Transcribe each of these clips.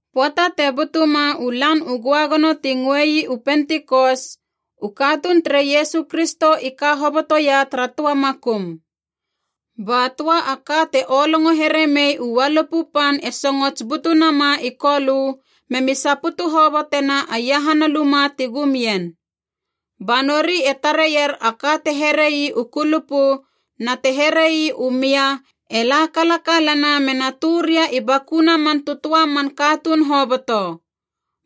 Pöata te butuma u Lan u Göagono ti ngöei u Pentikos, u katuun tere Iesu Kristo i ka hoboto ia tara töa makum. Ba töa a ka te olongo here mei u ualupu pan e songots butu nama i Kolö, memi saputu hobotena a iahana luma ti gumien. Ba nori e tareier a ka te here ii u kulupu na te here ii u mia e la kalakalana mena tö ria i bakuna man tötöa man katuun hoboto.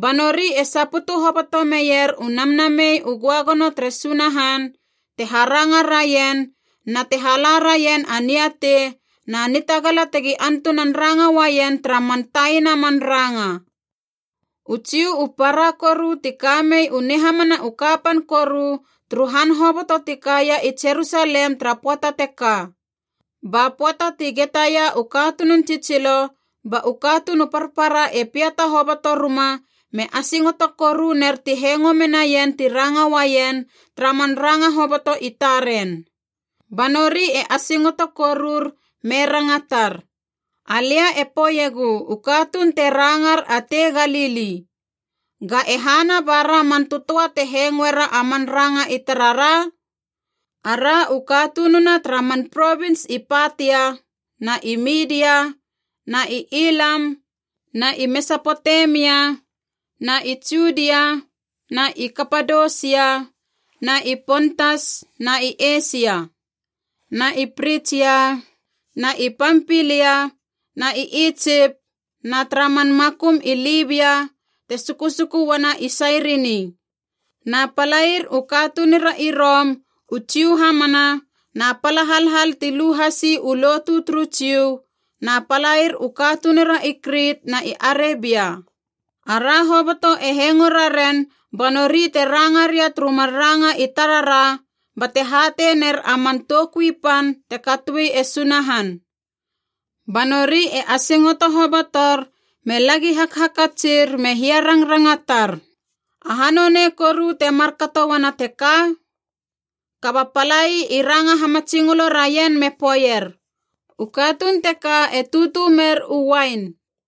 Ba nori e saputu hoboto meier u Namnamei u Göagono tere Sunahan, te haranga raien na te hala raien a niatei na nitagala tegi antunan ranga uaien tara man taina man ranga. U Jiu u para koru ti kamei u nihamana u kapan koru turu han hoboto ti kaia i Jerusalem tara pöata teka. Ba pöata ti getaia u katunun tsitsilo, ba u katuun u parpara e piata hoboto ruma me asingoto koru ner ti hengo menaien ti ranga uaien tara man ranga hoboto i taren. Ba nori e asingoto korur me rangatar, “Alia e poeiegu u katuun te rangar a tei Galili. Ga e hana bara man tötöa te hengoera a man ranga i tarara? Ara u katununa tara man provins i Patia na i Midia na i Ilam na i Mesapotemia na i Judia na i Kapadosia na i Pontas na i Eisia. Na i Pritsia na i Pampilia na i Itsip na tara man makum i Libia te sukusuku uana i Sairini. Na palair u katunura i Rom, u Jiu hamana na pala halhal ti lu hasi u lotu turu Jiu, na palair u katunura i Krit na i Arebia. Ara hoboto e hengo raren ba nori te ranga ria turu mar ranga i tarara bate hatei ner a man toukui pan te katoe e Sunahan!” Ba nori e asingoto hobotor me lagi hakhakatsir me hia rangrangatar, “Aha nonei koru te markato uana teka?” Kaba palai i ranga hamatsingolo raien me poeier, “U katuun teka e tutu mer a uain.”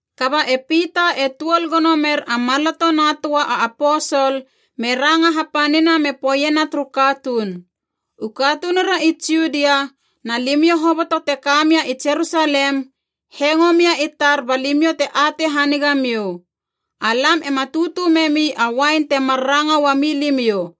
Kaba e Pita e tuol gono mer a maloto na töa a aposol me ranga hapanina me poeiena turu katuun, “U katunura i Judia na limiou hoboto te ka mia i Jerusalem, hengo mia i tar ba limiou te atei haniga miou. Alam ema tutu memi a uain temar ranga ua milimiou,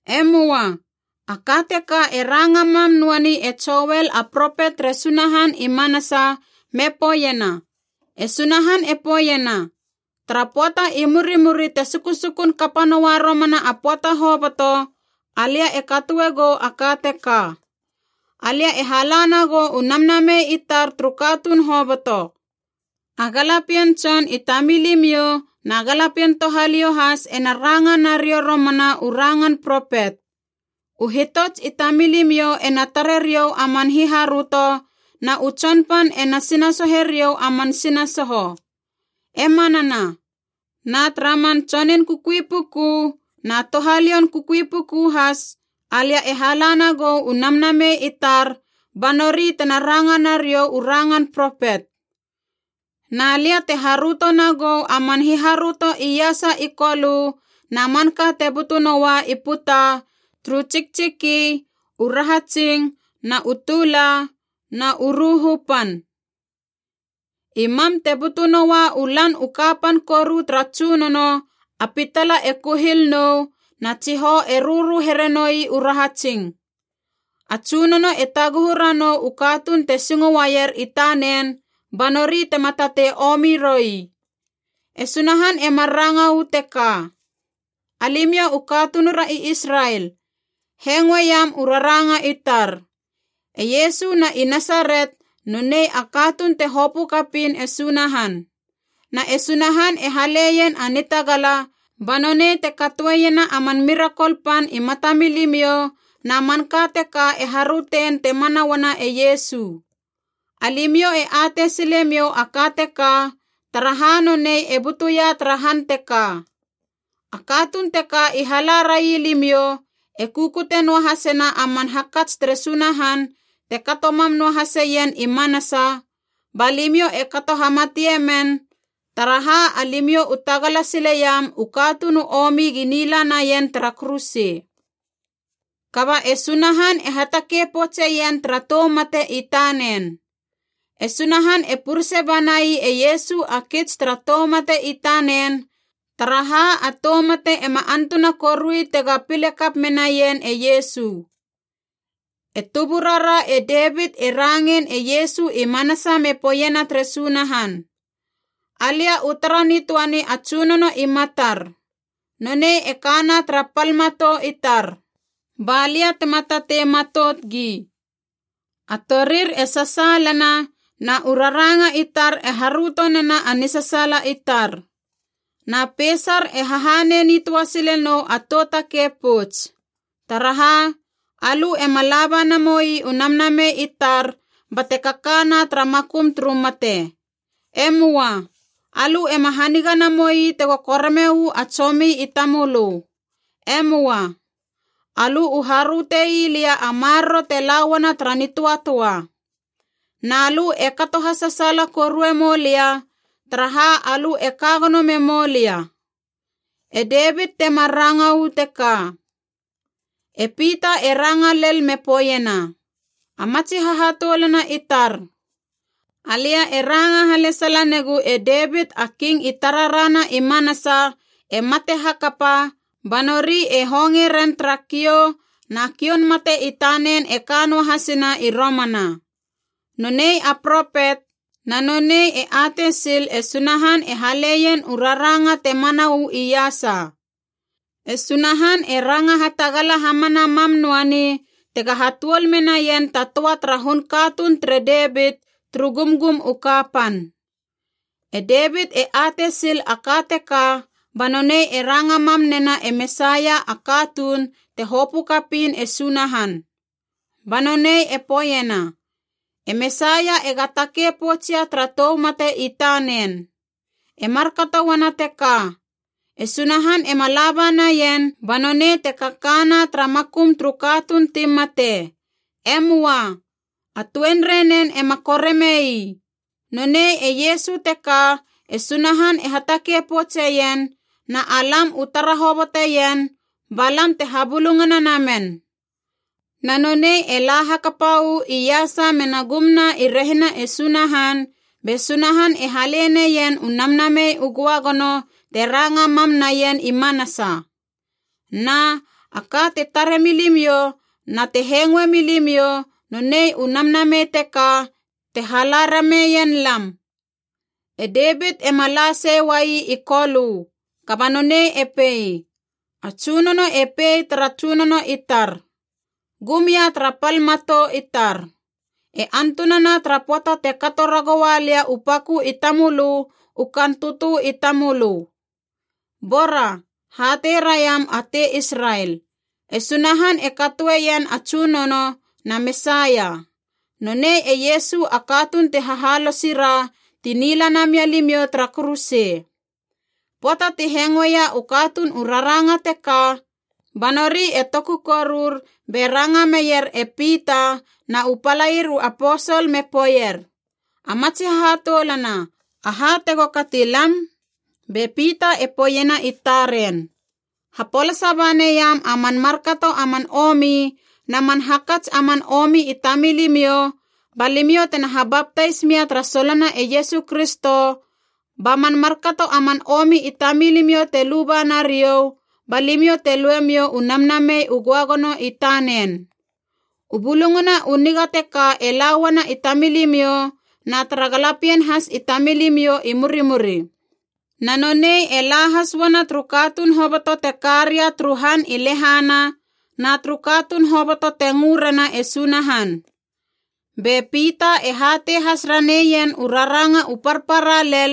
E möa, a ka teka e ranga mam noani e Joel a propet tere Sunahan i manasa me poeiena: ‘E Sunahan e poeiena, Tara pöata i murimuri te sukusukun kapa noa romana a pöata hoboto, alia e katoe gou a ka teka: Alia e hala nagou u Namnamei i tar turu katuun hoboto. A galapien tson i tamilimiou na galapien touhaliou has ena ranga nariou romana u rangan propet. U hitots i tamilimiou ena tare riou a man hiharöto, na u tsonpan ena sinasohe riou a man sinasoho. E manana. Na tara man tsonun kukui puku na touhalioun kukui puku has alia e hala nagou u Namnamei i tar, ba nori tena ranga nariou u rangan propet. Na lia te haröto nagou a man hiharöto iasa i kolö na manka te butu noua i puta turu tsiktsiki u rahatsing na u tula na u ruhu pan. I mam te butu noua u Lan u kapan koru tara Tsunono a pitala e kuhil nou na tsihou e rörö here noi u rahatsing. A Tsunono e taguhu ranou u katuun te singo uaier i tanen, ba nori tema tatei omi roi.’” E Sunahan e mar ranga uu teka. “Alimiou u katunura i Israel, hengoeiam u raranga i tar. E Iesu na i Nasaret nonei a katuun te hopö kapiin e Sunahan. Na e Sunahan e haleien a nitagala ba nonei te katoeiena a man mirakol pan i matamilimiou, na manka teka e harötein te mana uana e Iesu. Alimiou e atei sile miou a ka teka, taraha nonei e butuia tara han teka. A katuun teka i hala rai limiou, e kukute noahasena a man hakats tere Sunahan te kato mam noahaseien i manasa, ba limiou e kato hamatie men, taraha alimiou u tagala sileiam u katuun u omi gi nila naien tara kuruse. Kaba e Sunahan e hatakei poutseien tara tou mate i tanen. E Sunahan e purese banai e Iesu a kits tara tou mate i tanen, taraha a tou mate ema antuna korui tega pile kap menaien e Iesu. E tuburara e Devit e rangein e Iesu i manasa me poeiena tere Sunahan: ‘Alia u tara nitöani a Tsunono i matar. Nonei e kana tara pal matou i tar ba lia tema tatei matout gi. A torir e sasaalana na u raranga i tar e haröto nena a nisasaala i tar. Na peisar e hahanei nitöa sile nou a tou takei pouts. Taraha, alö ema laba namoi u namnamei i tar bate kakana tara makum turu mate. E möa. Alö ema haniga namoi tego koreme uu a tsomi i tamölö. E möa. Alö u haröte ii lia a maroro te la uana tara nitöatöa. Na lö e kato hasasaala korue mou lia, taraha alö e ka gono memou lia.’ E Devit temar ranga uu teka.” E Pita e ranga lel me poeiena, “A matsi hahatoulana i tar, alia e ranga halesala negu e Devit a King i tarara na i manasa e mate hakapa ba nori e honge ren tara kiou, na kioun mate i tanen e ka noa hasina i romana. Nonei a propet, na nonei e atei sil e Sunahan e haleien u raranga te mana uu iasa. E Sunahan e ranga hatagala hamana mam noani tega hatuol menaien ta töa tara hun katuun tere Devit turu gumgum u kapan. E Devit e atei sil a ka teka ba nonei e ranga mam nena e Mesaia a katuun te hopö kapiin e Sunahan. Ba nonei e poeiena, e Mesaia ega takei poutsia tara tou mate i tanen. E markato uana teka, ‘E Sunahan ema laba naien ba nonei te kakana tara makum turu katuun ti mate. E möa. A tuenrei nen ema koreme ii.’ Nonei e Iesu teka e Sunahan e hatakei poutseien, na alam u tara hoboteien ba lam te habulungana namen. Na nonei e la hakapa uu iasa mena gumna i rehina e Sunahan, be Sunahan e hale neien u Namnamei u Göagono te ranga mam naien i manasa. Na, a ka te tare milimiou na te hengoe milimiou nonei u Namnamei teka te hala rameien lam. E Devit ema la sei uai i Kolö, kaba nonei e pei, ‘A Tsunono e pei tara Tsunono i tar: Gum ia tara pal matou i tar, e antunana tara pöata te kato ragoua lia u pakö i tamölö u kaan tötö i tamölö.’ “Bora, hatei raiam a tei Israel: E Sunahan e katoeien a Tsunono na Mesaia, nonei e Iesu a katuun ti hahalosi ra ti nila namia limiou tara kuruse.” Pöata ti hengoeia u katuun u raranga teka, ba nori e toku korur be ranga meier e Pita na u palair u aposol me poeier, “A matsi hahatoulana, aha tego kati lam?” Be Pita e poeiena i taren, “Hapolasa ba neiam a man markato a man omi na man hakats a man omi i tamilimiou ba limiou tena habaptais mia tara solona e Iesu Kristo ba man markato a man omi i tamilimiou te luba nariou ba limiou te lue miou u Namnamei u Göagono i tanen. U Bulungana u Niga teka e la uana i tamilimiou na tara galapien has i tamilimiou i murimuri. Na nonei e la has uana turu katuun hoboto te ka ria turu han i lehana na turu katuun hoboto te ngö rena e Sunahan.” Be Pita e hatei has raneien u raranga u parpara lel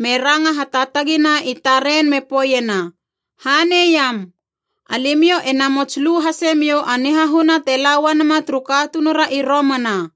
me ranga hataatagina i taren me poeiena, “Haneiam! Alimiou e namots lu hase miou a nihahuna te la uanama turu katunura i romana.”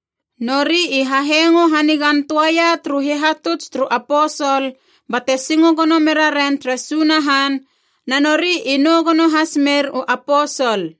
Nori i ha hengo hanigan töaia turu hihatuts turu aposol bate singo gono meraren tere Sunahan, na nori i nou gono has mer u aposol.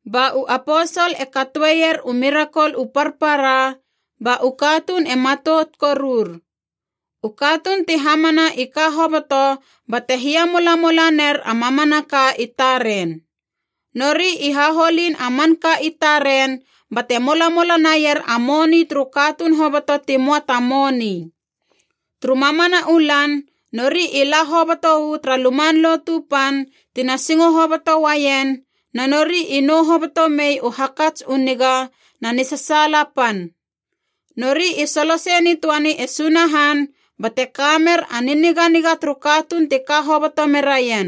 Ba u aposol e katoeier u mirakol u parpara, ba u katuun e matout korur. U katuun ti hamana i ka hoboto bate hiamolamola ner a mamanaka i taren. Nori i haholin a manka i taren bate molamola naier a moni turu katuun hoboto ti möa ta moni. Turu mamana u lan nori i la hoboto uu tara Luman Lotu Pan tina singo hoboto uaien na nori i nou hoboto mei u hakats u niga na nisasaala pan. Nori i solosei nitöani e Sunahan bate ka mer a niniganiga turu katuun ti ka hoboto meraien.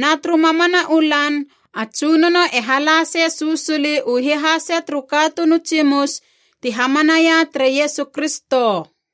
Na turu mamana u lan a Tsunono e halasei susuli u hihase turu katuun u tsimus ti hamanaia tere Iesu Kristo.